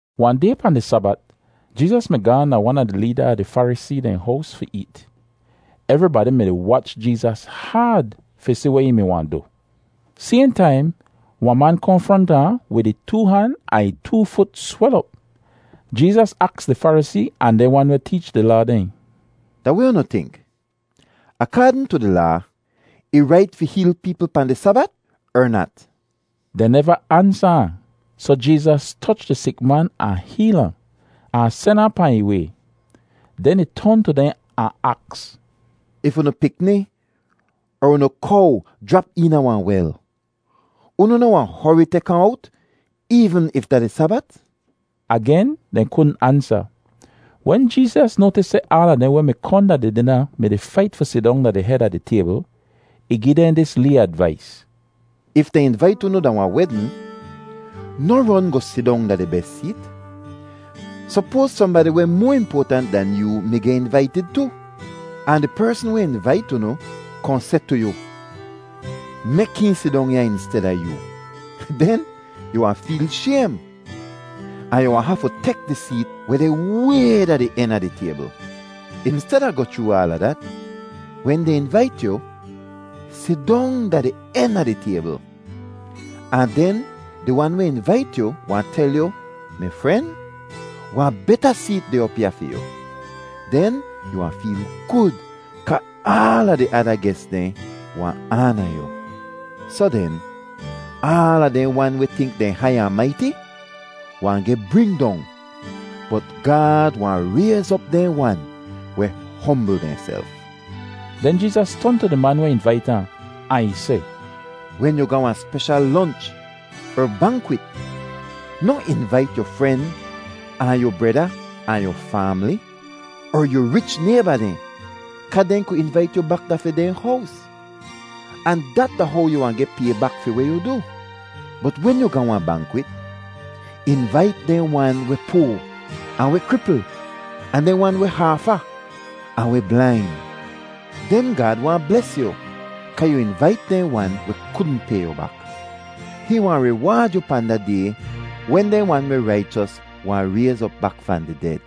Wahn day, pahn di Sabat, Jeezas mi gaahn da wan a di leeda a di Farisee dehn hows fi eet. Evribadi mi-di wach Jeezas haad fi si weh ih mi wahn du. Sayhn taim wahn man kohn fronta ahn wid ih too han ahn ih too fut swel op. Jeezas aks di Farisee ahn dehn wan weh teech di Laa dehn, “Da weh unu tink? Akaadn tu di Laa, ih rait fi heel peepl pahn di Sabat er nat?” Dehn neva ansa ahn, soh Jeezas toch di sik man ahn heel ahn, ahn sen ahn pahn ih way. Den ih ton tu dehn ahn aks, “If unu pikni er unu kow jrap eena wahn wel, unu noh wahn hori tek ahn owt, eevn if da di Sabat?” Agen, dehn kudn ansa. Wen Jeezas noatis seh aala dehn weh mi kohn da di dina mi-di fait fi sidong da di hed a di taybl, ih gi dehn dis lee advais: “If dehn invait unu da wahn wedn, noh ron goh sidong da di bes seet. Sopoaz sohnbadi weh moa impoatant dan yoo mi geh invaitid tu, ahn di persn weh invait unu kohn seh tu yu, ‘Mek hihn sidong ya insteda yoo.’ Den yu wahn feel shaym, ahn yu wahn hafu tek di seet weh deh way da di en a di taybl! Insteda goh chroo aala dat, wen dehn invait yu, sidong da di en a di taybl. Ahn den di wan weh invait yu wahn tel yu, ‘Mi fren, wahn beta seet deh op ya fi yu!’ Den yu wahn feel gud kaa aala di ada ges dehn wahn aana yu. Soh den, aala dehn wan weh tink dehn hai ahn maiti wahn geh bring dong, bot Gaad wahn rayz op dehn wan weh hombl dehnself.” Den Jeezas ton tu di man weh invait ahn, ahn ih seh, “Wen yu ga wahn speshal lonch er bankwit, noh invait yu fren ahn yu breda ahn yu faamli, er yu rich nayba dehn; kaa dehn ku invait yu bak da fi dehn hows, ahn dat da how yu wahn geh pay bak fi weh yu du. Bot wen yu ga wahn bankwit, invait dehn wan weh poa, ahn weh kripl, ahn dehn wan weh haafa, ahn weh blain. Den Gaad wahn bles yu kaa yu invait dehn wan weh kudn pay yu bak. Hihn wahn riwaad yu pahn da day wen dehn wan weh raichos wahn rayz op bak fahn di ded.”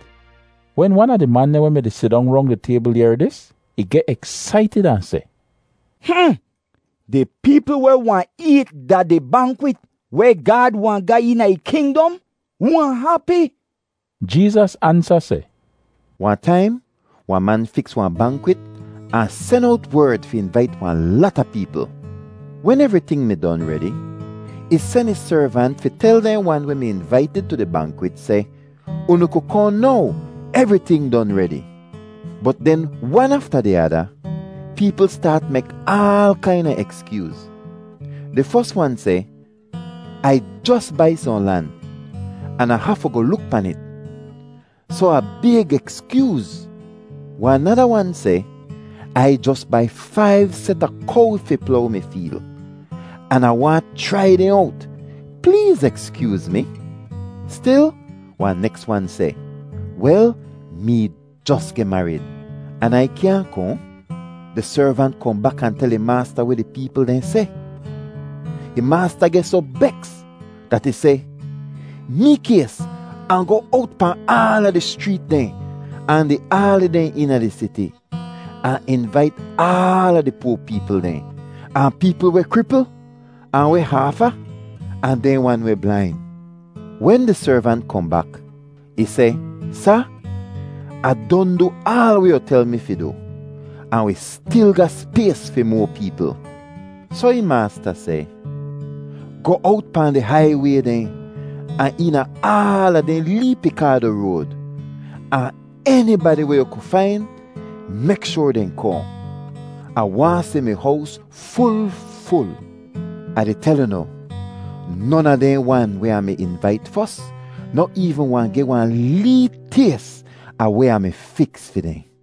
Wen wan a di man dehn weh mi-di sidong rong di taybl yehr dis, ih geh eksaitid ahn seh, “Hmm! Di peepl weh wahn eet da di bankwit weh Gaad wahn ga eena ih kingdom wahn hapi!” Jeezas ansa seh, “Wahn taim wahn man fiks wahn bankwit ahn sen owt werd fi invait wahn lata peepl. Wen evriting mi don redi, ih sen ih servant fi tel dehn wan weh mi invaitid tu di bankwit seh, ‘Unu ku kohn now; evriting don redi.’ “Bot den wan afta di ada, peepl staat mek aal kaina ekskyooz. Di fos wan seh, ‘Ai jos bai sohn lan, an Ah hafu goh luk pan it. Soh Ah bayg ekskyooz.’ “Wahn nada wan seh, ‘Ai jos bai faiv set a kow fi plow mi feel, an Ah waahn chrai dehn owt. Pleez ekskyooz mi.’ “Stil wahn neks wan seh, ‘Wel, mee jos geh marid, an Ai kyaahn kohn.’ “Di servant kohn bak ahn tel ih maasta weh di peepl dehn seh. Ih maasta geh soh beks dat ih seh, ‘Mikays ahn goh owt pahn aala di schreet dehn ahn di aali dehn eena di siti, ahn invait aala di poa peepl dehn, ahn peepl weh kripl, ahn weh haafa, ahn dehn wan weh blain.’ “Wen di servant kohn bak, ih seh, ‘Sa, Ah don du aal weh yu tel mi fi du, ahn wi stil ga spays fi moa peepl.’ “Soh ih maasta seh, ‘Goh owt pahn di haiway dehn ahn eena aala dehn lee pikaado road, ahn enibadi weh yu ku fain, mek shoar dehn kohn. Ah waahn si mi hows ful ful. Ah di tel unu, non a dehn wan weh Ah mi invait fos noh eevn wahn geh wahn lee tays a weh Ah mi fiks fi dehn.’”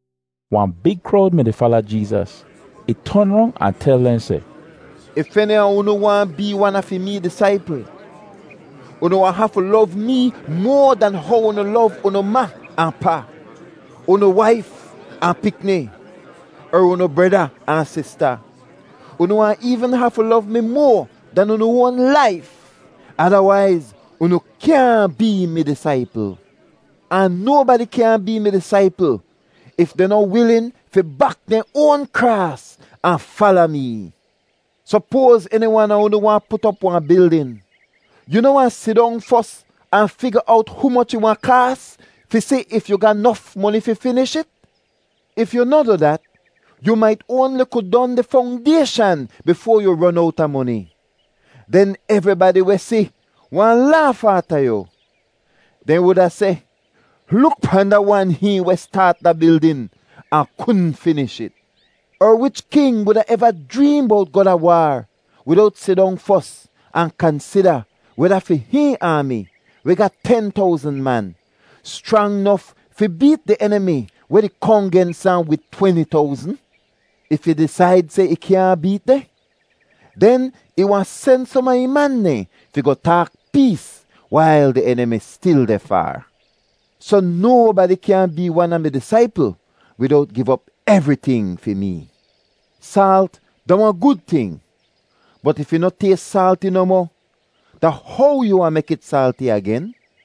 Wahn big krowd mi-di fala Jeezas. Ih ton rong ahn tel dehn seh, “If eni a unu waahn bee wan a fi mee disaipl, unu wahn hafu lov mee moa dan how unu lov unu ma ahn pa, unu waif ahn pikni, er unu breda ahn sista. Unu wahn eevn hafu lov mi moa dan unu oan laif! Adawaiz, unu kyaahn bee mi disaipl. Ahn nobadi kyaahn bee mi disaipl if dehn noh wilin fi bak dehn oan kraas ahn fala mee. “Sopoaz eni wan a unu waahn put op wahn bildin. Yu noh wahn sidong fos ahn figa owt humoch ih wahn kaas, fi si if yu ga nof moni fi finish it? If yu noh du dat, yu mait oanli ku don di fongdayshan bifoa yu ron owta moni. Den evribadi weh si wahn laaf aata yu. Dehn wuda seh, ‘Luk pahn da wan hihn weh staat da bildin ahn kudn finish it!’ “Er wich king wuda eva jreem bowt goh da waar widowt sidong fos ahn kansida weda fi hihn aami, weh ga ten towzn man, schrang nof fi beet di enimi weh di kohn gens ahn wid tweni towzn? If ih disaid seh ih kyaahn beet dehn, den ih wahn sen som a ih man dehn fi goh taak pees wail di enimi stil deh faar. Soh, nobadi kyaahn bee wan a mi disaipl widowt giv op evriting fi mee. “Saalt da wahn gud ting, bot if ih noh tays saalti nohmoh, da how yu wahn mek it saalti agen?